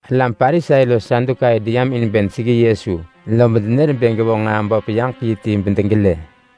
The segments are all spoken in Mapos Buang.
Alam Parisai los Sadukai deyam in bë deseggi Yesu, lob denër bë gevonġ nġaa böp yaġek yi ti bedegelë.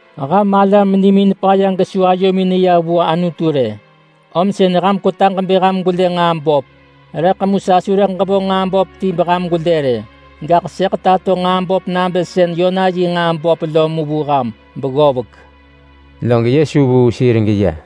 Ham alam nimin paya, ham nebë avëh baggëb, om sën ham kwetaġ bë ham gwelë nġaa böp. Rëḳ mu sa su rëḳ ġevonġ nġaa böp ti beham gwelë rë. Gaḳ sëḳ tato nġaa böp nabë sën Yona yi nġaa böp lo vu ham mu beggovek.” Log Yesu vuu sir geya.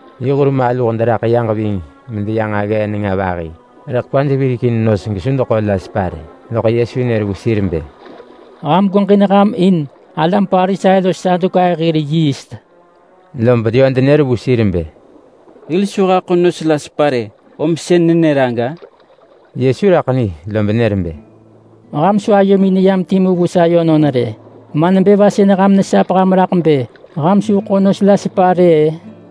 Yi hur maluh deraḳ yaġ ving yi medeya nġaggee nenga vahi, rëḳ kwaj virekin nos gesu deḳo la sepa rë. Loḳ Yesu nër vu sir bë, “Ham gweġin ham in alam Parisai los Sadukai hir yiist!” Lob yö denër vu sir bë, “Hil su haḳo nos la sepa rë, om sën nenër aga!” Yesu raḳ ni lob nër bë, “Ham su ayomin neyam timu vu sa yönon rë! Ma nebë va sën ham nesap ham raḳ bë ham su ḳo nos la sepa rë-ë?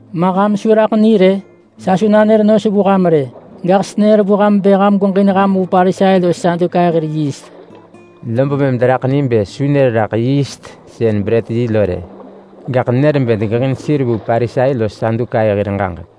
Ma ham su raḳ ni rë? Sa su nanër nos vu ham rë! Gaḳ senër vu ham bë ham gweġin ham vu Parisai los Sadukai hir yiist!” Lob mëm deraḳ ni bë su nër raḳ yiist sën brët yi lo rë. Gaḳ nenër bë degeġin sir vu Parisai los Sadukai hir ġaġek.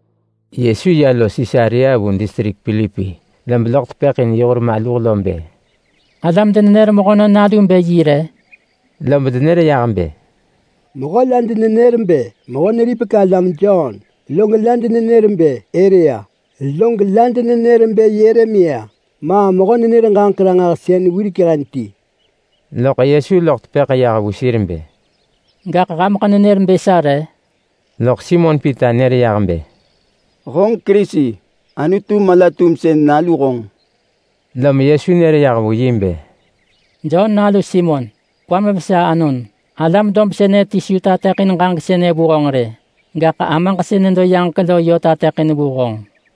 Yesu ya los Sisarea vu distrik Pilipi, lob loḳ tepëḳ in yi hur maluh bë, “Alam denenër Mehönon Nalu bë yi re?” Lob denër yah bë, “Mehö la denenër bë Mehö-neripek-alam Jon. Log la denenër bë Elia. Log la denenër bë Yeremia, ma mehö-nenër-ġaġek-ranġahsën wirek hen ti.” Loḳ Yesu loḳ tepëḳ yah vu sir bë, “Gaḳ hameḳ nenër bë sa re?” Loḳ Simon Pita nër yah bë, “Honġ Kerisi! Anutu mala-tumsën Nalu honġ!” Lom Yesu nër yah vu yi bë, “Jon nalu Simon! Kwam vesa anon! Alam dob sënë ti su tateḳin ġaġek sënë vu honġ rë. Gaḳ Amaġ sën nedo yaġek lo yö tateḳin vu honġ.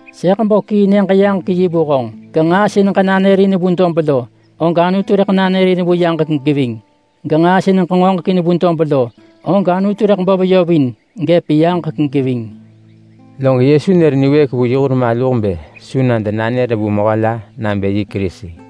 Sëḳ bo kii Nyëġ-yaġek-yi vu honġ. Genġaa sën ġenanërin vu dob lo, og Anutu rëḳ nanërin vu yaġek geving. Genġaa sën ġengoġekin vu dob lo, og Anutu rëḳ bo veyovin gëp yaġek geving.” Log Yesu nër niwëëk vu yi hur maluh bë su na denanër vu mehö la nabë yi Kerisi.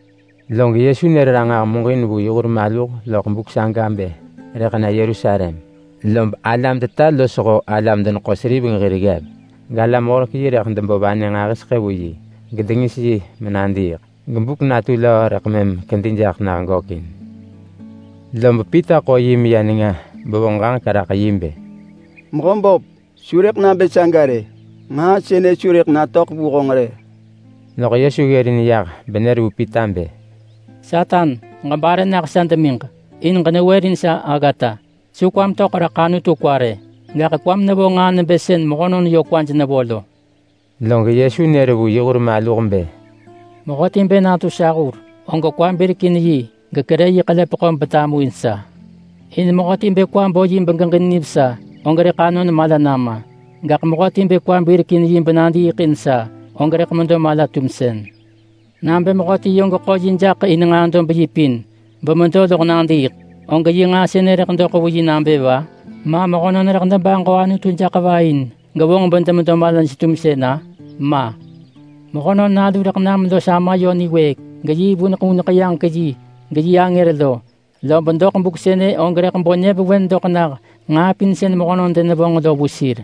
Log Yesu nër ranġah muġin vu yi hur maluh loḳ buk saga bë rëḳ na Yerusalem, lob alam-teta losho alam-deneḳo-seriveng hir ggev, galam-horek-yi rëḳ debo vanë nġahiseḳë vu yi, gedengis yi menadiiḳ, gebuk natu löö rëḳ mëm kedi jaḳ nah gökin. Lob Pita ḳo yi meya nenga bevonġ ġaġek raḳ yi bë, “Mehöböp, su rëḳ nabë saga rë! Nġaa sënë su rëḳ natöḳ vu honġ rë!” Loḳ Yesu ggërin yah benër vu Pita bë, “Satan! Ġebare nah sa demiġ, in ġenewërin sa aggata! Su kwam töḳ raḳ Anutu kwa rë, gaḳ kwam nevo nġaa nebë sën mehönon yö kwaj nevo lo!” Log Yesu nër vu yi hur maluh bë, “Mehöti bë natu sa hur, og kwa birek in yi gekerë yi ḳelepeḳo betamuin sa. In mehöti bë kwa bo yi begeġin nivesa, og rëḳ anon mala nama. Gaḳ mehöti bë kwa birekin yi benadiiḳ in sa, og rëḳ medo mala-tumsën. Nabë mehöti yö geḳo yi jaḳ in nġaa dob yi pin bemedo loḳ nadiiḳ, og yi nġaa sënë rëḳ doḳ vu yi nabë va? Ma mehönon rëḳ debaġo Anutu jaḳ va in gevonġ bedemedo malaj-tumsën-a? Ma! Mehönon Nalu rëḳ nam los Ama yö niwëëk geyi vuneḳ vuneḳ yaġek yi geyi angër lo, lob doḳ buk sënë og rëḳ bo nyëvewen doḳ nah nġaa pin sën mehönon denevonġ lo vu sir.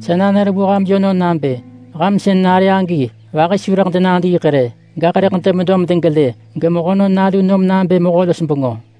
Sa nanër vu ham yönon nabë ham sën nare agi vahi su rëḳ denadiiḳ rë, gaḳ rëḳ demedo medegelë geMehönon Nalu nom nabë mehö-los-bengö in geġin hil.”